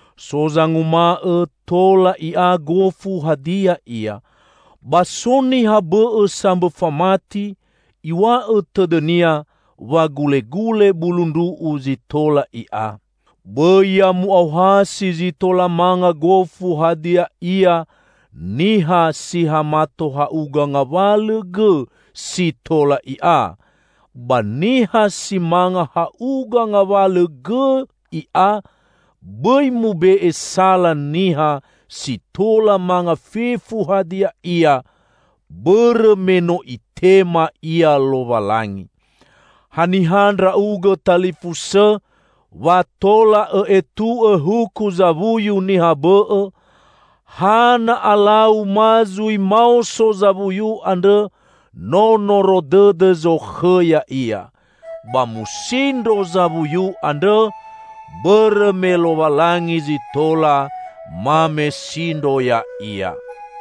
So zanguma'õ tola i'a gofu hadia ia. Ba so niha bõ'õ sambõ famati; iw̃a'õ tõdõnia wa gulegule bulu ndru'u zi tola i'a. Bõi ya mu'aohasi zi tola manga gofu hadia ia niha si ha mato ha'uga ngawalõ gõ si tola i'a, ba niha si manga ha'uga ngawalõ gõ i'a bõi mube'e sala niha si tola manga fefu hadia ia, bõrõ me no Itema ia Lowalangi. Haniha ndra'ugõ talifusõ wa tola õ'etu'õ huku zawuyu niha bõ'õ? Ha na alau ma zui maoso zawuyu andrõ no noro dõdõ zokhõ ya'ia. Ba musindro zawuyu andrõ, bõrõ me Lowalangi zi tola mamesindro ya'ia.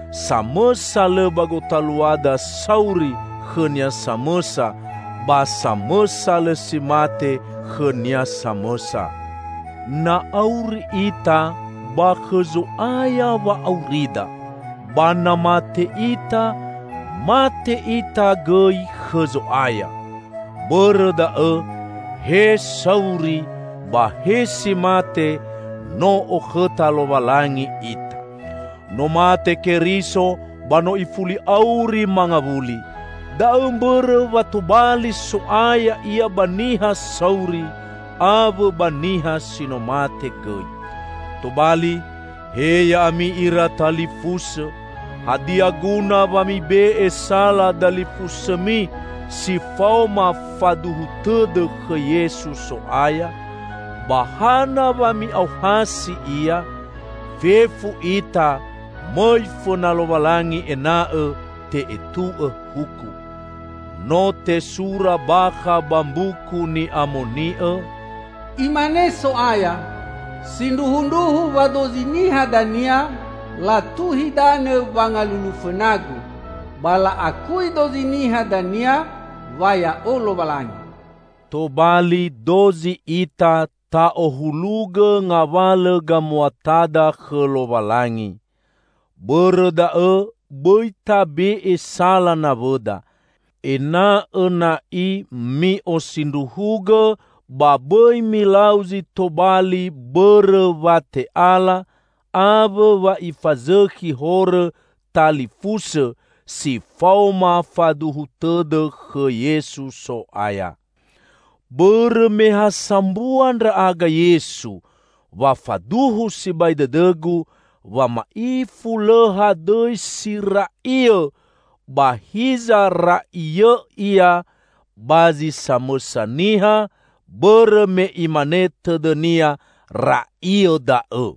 Samõsa lõ ba gotaluada sauri khõnia samõsa; ba samõsa lõ si mate khõnia samõsa. Na auri ita, ba khõ Zo'aya wa'aurida. Ba na mate ita, mate ita gõi khõ Zo'aya. Bõrõ da'õ, he sauri ba he si mate, no okhõta Lowalangi ita. No mate Keriso ba no ifuli auri mangawuli. Da'õ mbõrõ wa tobali So'aya Ia ba niha sauri awõ ba niha si no mate gõi. Tobali, he ya'ami ira talifusõ! Hadia guna wa mibe'e sala dalifusõmi si faoma faduhu tõdõ khõ Yesu So'aya? Ba hana wa mi'aohasi ia? Fefu ita mõi fõna Lowalangi ena'õ te'etu'õ huku. No tesura bakha ba Mbuku Ni'amoni'õ, Imane So'aya, "Sindruhundruhu wa dozi niha dania latuhi danõ wangalulu fõna-Gu; ba la'akui dozi niha dania wa Ya'o Lowalangi." Tobali dozi ita ta'ohulugõ ngawalõ gamuatada khõ Lowalangi. Bõrõ da'õ bõi tabe'e sala nawõda. Ena'õ na'i mi'osindruhugõ ba bõi milau zi tobali bõrõ wa te'ala awõ wa ifazõkhi horõ talifusõ si faoma faduhu tõdõ khõ Yesu So'aya. Bõrõ me ha sambua ndra'aga Yesu, wa faduhu sibai dõdõgu wa ma'ifu lõ hadõi si ra'iõ; ba hiza ra'iõ ia ba zi samõsa niha bõrõ me imane tõdõnia ra'iõ da'õ.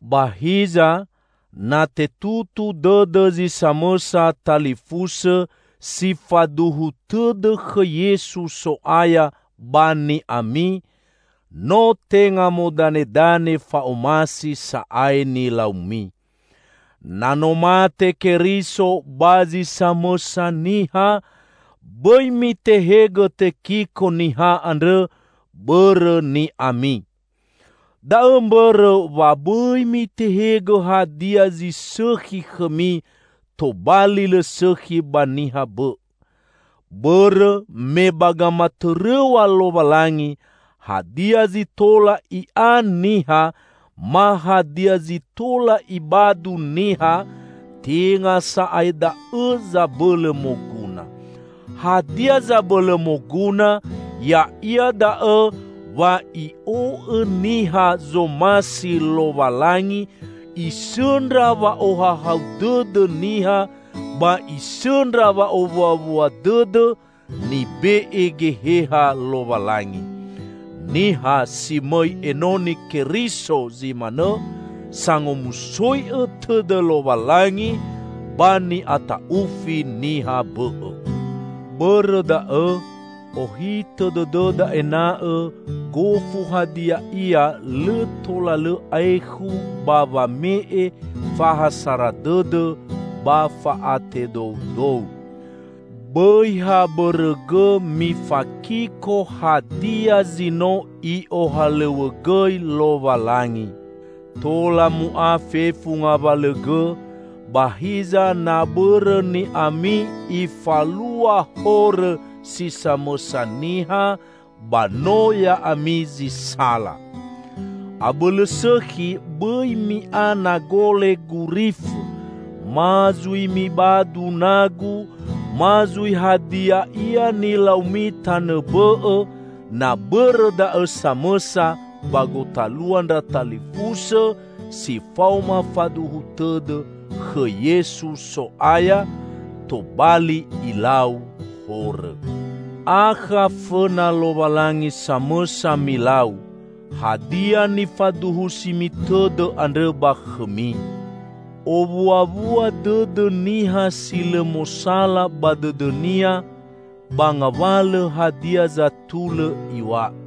Ba hiza, na tetutu dõdõ zi samõsa talifusõ si faduhu tõdõ khõ Yesu So'aya ba ni'ami, no tenga modanedane fa'omasi sa'ae nilaumi. Na no mate Keriso ba zi samõsa niha, bõi mitehegõ tekiko niha andrõ bõrõ ni'ami. Da'õ mbõrõ wa bõi mitehegõ hadia zi sõkhi khõmi, tobali lõ sõkhi ba niha bõ'õ. Bõrõ me ba gamatõrõw̃a Lowalangi, hadia zi tola i'a niha, ma hadia zi tola ibadu niha, tenga sa'ae da'õ zabõlõ moguna. Hadia zabõlõ moguna ya'ia da'õ wa i'o'õ niha zomasi Lowalangi, isõndra wa'ohahau dõdõ niha ba isõndra wa'owuawua dõdõ nibe'e Geheha Lowalangi. Niha si mõi enoni Keriso zi manõ, sangomusoi'õ tõdõ Lowalangi ba ni'ata'ufi niha bõ'õ. Bõrõ da'õ ohitõ dõdõda ena'õ gofu hadia ia lõ tola lõ aekhu ba wame'e fa ha sara dõdõ ba fa'atedoudou. Bõi ha bõrõ gõ mifakiko hadia zi no I'ohalõw̃õgõi Lowalangi. Tola mu'a fefu ngawalõ gõ ba hiza na bõrõ ni'ami ifalua horõ si samõsa niha, ba no ya'ami zi sala. Abõlõ sõkhi bõi mi'a nagole gurifõ ma zui mibadu nagu ma zui hadia ia nilaumi tanõ bõ'õ na bõrõ da'õ samõsa ba gotalua ndra talifusõ si faoma faduhu tõdõ khõ Yesu So'aya, tobali ilau horõ. Akha fõna Lowalangi samõsa milau, hadia nifaduhusimi tõdõ andrõ ba khõmi. Owuawua dõdõ niha si lõ mosala ba dõdõnia ba ngawalõ hadia zatulõ iw̃a'õ.